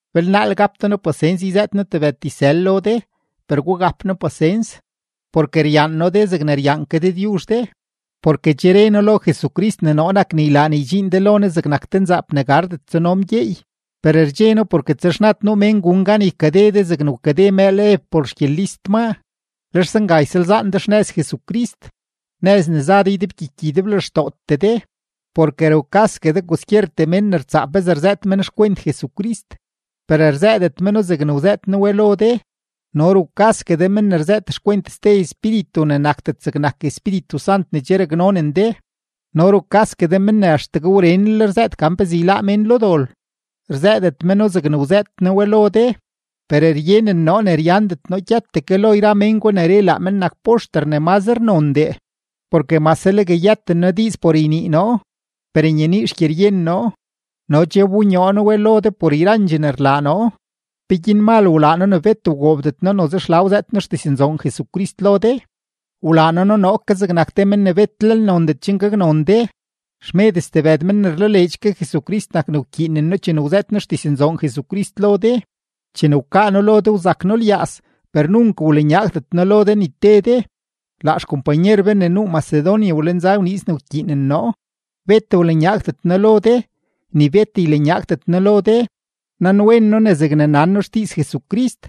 Belnaal gap de noo pasens yzëët noo tebëd dizsël lo de, per gugap noo pasens. Porke ryaan noo de zegne ryaan ke Dëdyuzh de, porke che re noo lo Jesucrist ne noo nak ne ylaa ne ydxiin de lo Ne zegnak te nzaap ne gardet tsuno mgyeey. Per rdxe noo porke texnad nuu mén gun gan ykade de zegne wkade mëël Ev por xgyelist maa, lex zenga ysalzaan de xnëz Jesucrist, nëz ne za de ydebgyiky ydeblextootee de. Porke rukasgue de kwaskyertee mén ne rtsaa pezee rzëët men xkwent Jesucrist, per rzëëdet meno zegne wzëët noo we lo de, no rukasgue de men ne rzëët xkwent ste espíritu ne nakdet zegnak Espíritu Sant ne che raknonen de, no rukasgue de men ne axtegue wrenlel rzëët gan pezee yláá mén lo dol, rzëëdet meno zegne wzëët noo we lo de. Per ryenen noo ne ryandet noo gyëtdee ke lo yra mén gwa ne re ne laa men nak poxter ne mazre nondee. Porke mase legue yëten noo diiz por ynii noo, per nyenii xgyeryen noo; no che wbonyoo noo we lo de por yrandxee ne rlaa noo. ¿Peguin mal wlaa noo ne bet wgoobdet noo noze xla wzëët noo xdiznzoon Jesucrist lo de? Wlaa noo noo ke zegnak te men ne betlel nondet chen gaknon de. Xmed stebëd men ne rlaleedx ke Jesucrist nak ne wkyiinen noo chene wzëët noo xdiznzoon Jesucrist lo de. Chene wkaa noo lo de, wzak noo lyaaz, per nunk wlanyaagdet noo lo de ni te de; laa xkompanyer be ne nuu Macedonia wlenza wniiz ne wkyiinen noo. Bet wlanyaagdet noo lo de, ni bet ylanyaagdet noo lo de. Nanwen noo ne zegne nan noo xdiiz Jesucrist,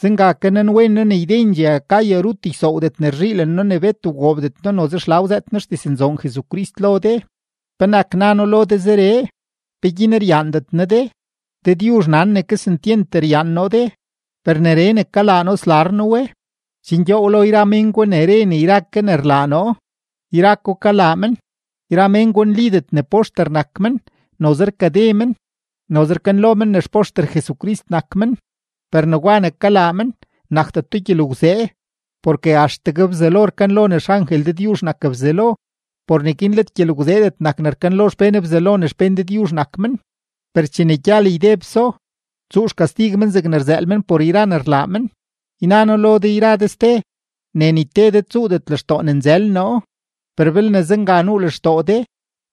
zenga ke nanwen noo ne ydendxee Acaya rut ysoowdet ne rzhiilen noo ne bet wgoobdet noo noze xla wzëët noo xdiznzoon Jesucrist lo de. ¿Penak na noo lo de zeree? ¿Peguin ryaandet noo de? Dëdyuzh nan ne kesentyent ryaan noo de. Per neree ne kalaa noo slar noo we, chen gyoow lo yra men gwa ne re ne yra ke ne rlaa noo, yra ko kalaa men. Yra men gwa nlidet ne poxter nak men, noze rkade men, noze rkanlo men ne xpoxter Jesucrist nak men. Per negwa ne kalaa men, nakdeto gyelgwzee, porke axtegue Bzelo rkanlo ne xangel Dëdyuzh nak Bzelo. Por neguin let gyelgwzeedet nak ne rkanlo xpén Bzelo ne xpén Dëdyuzh nak men, per chene gyal ydebso, tsuu xkastig men zegne rzëël men por yra ne rlaa men. Yna noo lo de yra de ste, ne ni te de tsuudet lextoo ne nzël noo, per belne zenga nuu lextoo de,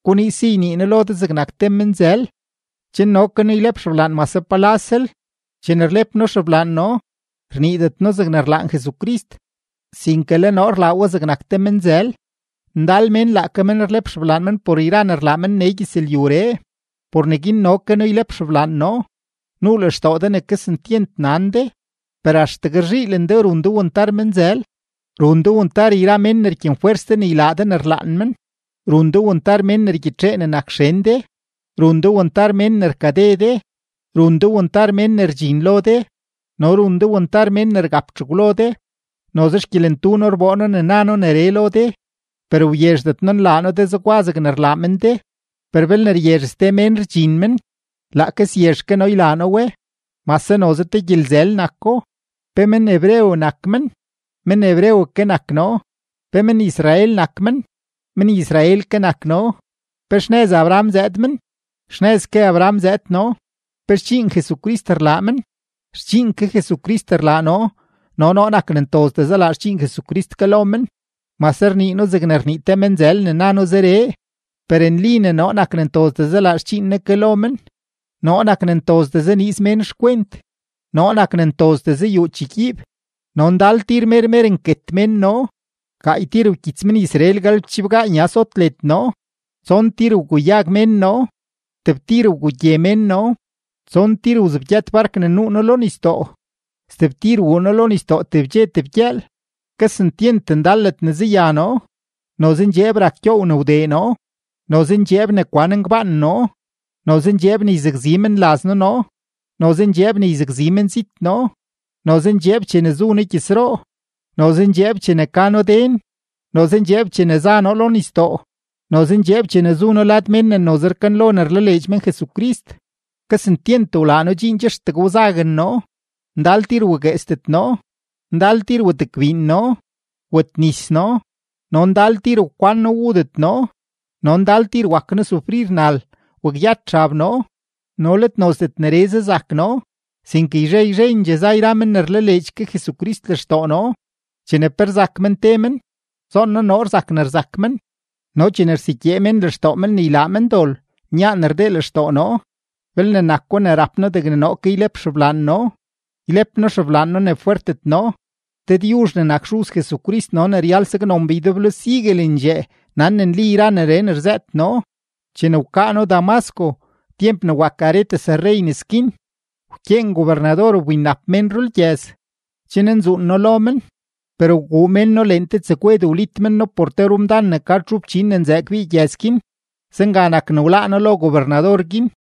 guniiz si ynii noo lo de zegnak te menzël, chen no ke noo ylep xeblaan mase palalsel. Chene rlep noo xeblaan noo, rniidet noo zegne rlaan Jesucrist, sinke le noo rlaa we zegnak te menzël. Ndal mén laake men rlep xeblaan men por yra ne rlaa men nee gyëzlyuree; por neguin no ke noo ylep xeblaan noo. Nuu lextoo de ne kesentyent nan de, per axtegue rzhiilen de run de wantar menzël. Run de wantar yra mén ne rkyenfwers de ne ylaa de ne rlaan men, run de wantar mén ne rgyitxee ne nak xen de, run de wantar mén ne rkade de, run de wantar mén ne rdxin lo de, no run de wantar mén ne rgap txegwlo de. Noze xgyelentu noo rboo noo ne na noo neree lo de, per wyezhdet noo nlaa noo de zegwa zegne rlaa men de. Per belne ryezh ste mén rdxin men, laake syezh ke noo ylaa noo we, mase noze te gyelzël nako. ¿Pe men-hebreo nak men? Men-hebreo ke nak noo. ¿Pe men-Israel nak men? Men-Israel ke nak noo. ¿Pe xnëz Abraham zëëd men? Xnëz ke Abraham zëëd noo. ¿Pe xdxiin Jesucrist rlaa men? Xdxiin ke Jesucrist rlaa noo, no noo nak ne ntozdee zalaa xdxiin Jesucrist ke lo men, mase rnii noo zegne rnii te menzël ne na noo zeree. Per nli ne noo nak ne ntozdee zalaa xdxiin Ne ke lo men, noo nak ne ntozdee zaniiz mén xkwent, noo nak ne ntozdee zayuu chegyiib, no ndal tir mer mer nket mén noo. Gaay tir wkyits men-Israel galebchibgaa nya sot led noo. Tson tir wguyag mén noo; tebtir wgugye mén noo; tson tir wzebgyët bark ne nuu noo lo nisdoo, stebtir wuu noo lo nisdoo tebdxe tebgyëël. Kesentyent ndal ledne zaya noo; noze ndxeeb rak gyoow ne wdee noo, noze ndxeeb ne kwan ngbaan noo, noze ndxeeb ne yzakzi menlaz noo noo, noze ndxeeb ne yzakzi menzit noo, noze ndxeeb chene zu noo gyëzroo, noze ndxeeb chene ka noo den, noze ndxeeb chene za noo lo nisdoo, noze ndxeeb chene zu noo lad mén ne noze rkanlo ne rlaleedx men Jesucrist. Kesentyent wlaa noo dxiin che axtegue wzaguen noo, ndal tir wagueesdet noo, ndal tir wetgbiin noo, wetnis noo, no ndal tir wkwan noo wudet noo, no ndal tir wak noo sufrir nal, wakyët xab noo. No let nozdet neree zazak noo, sinke yzhe yzhendxee za yra men ne rlaleedx ke Jesucrist lextoo noo. Chene pe rzak men te men, zoon noo noo rzak ne rzak men, no chene rsegyee mén lextoo men ne ylaa men dol, nyaan rdee lextoo noo. Belne nako ne rap noo degne noo ke ylep xeblaan noo, ylep noo xeblaan noo ne fwertet noo. Dëdyuzh ne nak Xuz Jesucrist no ne ryal saknon be ydeblo siguelendxee nan ne nli yra neree ne rzëët noo. Chene wkaa noo Damasco, tyemp ne wak Aretas rrey nes guin, wkyeen gobernador wbinnap mén rulgyëz, chen nzuun noo lo men. Per wguu mén noo leen te tsegwed, wlit men noo por te rumdan ne ka txu fchin ne nzëë kbii gyëz guin, zenga nak ne wláá noo lo gobernador guin.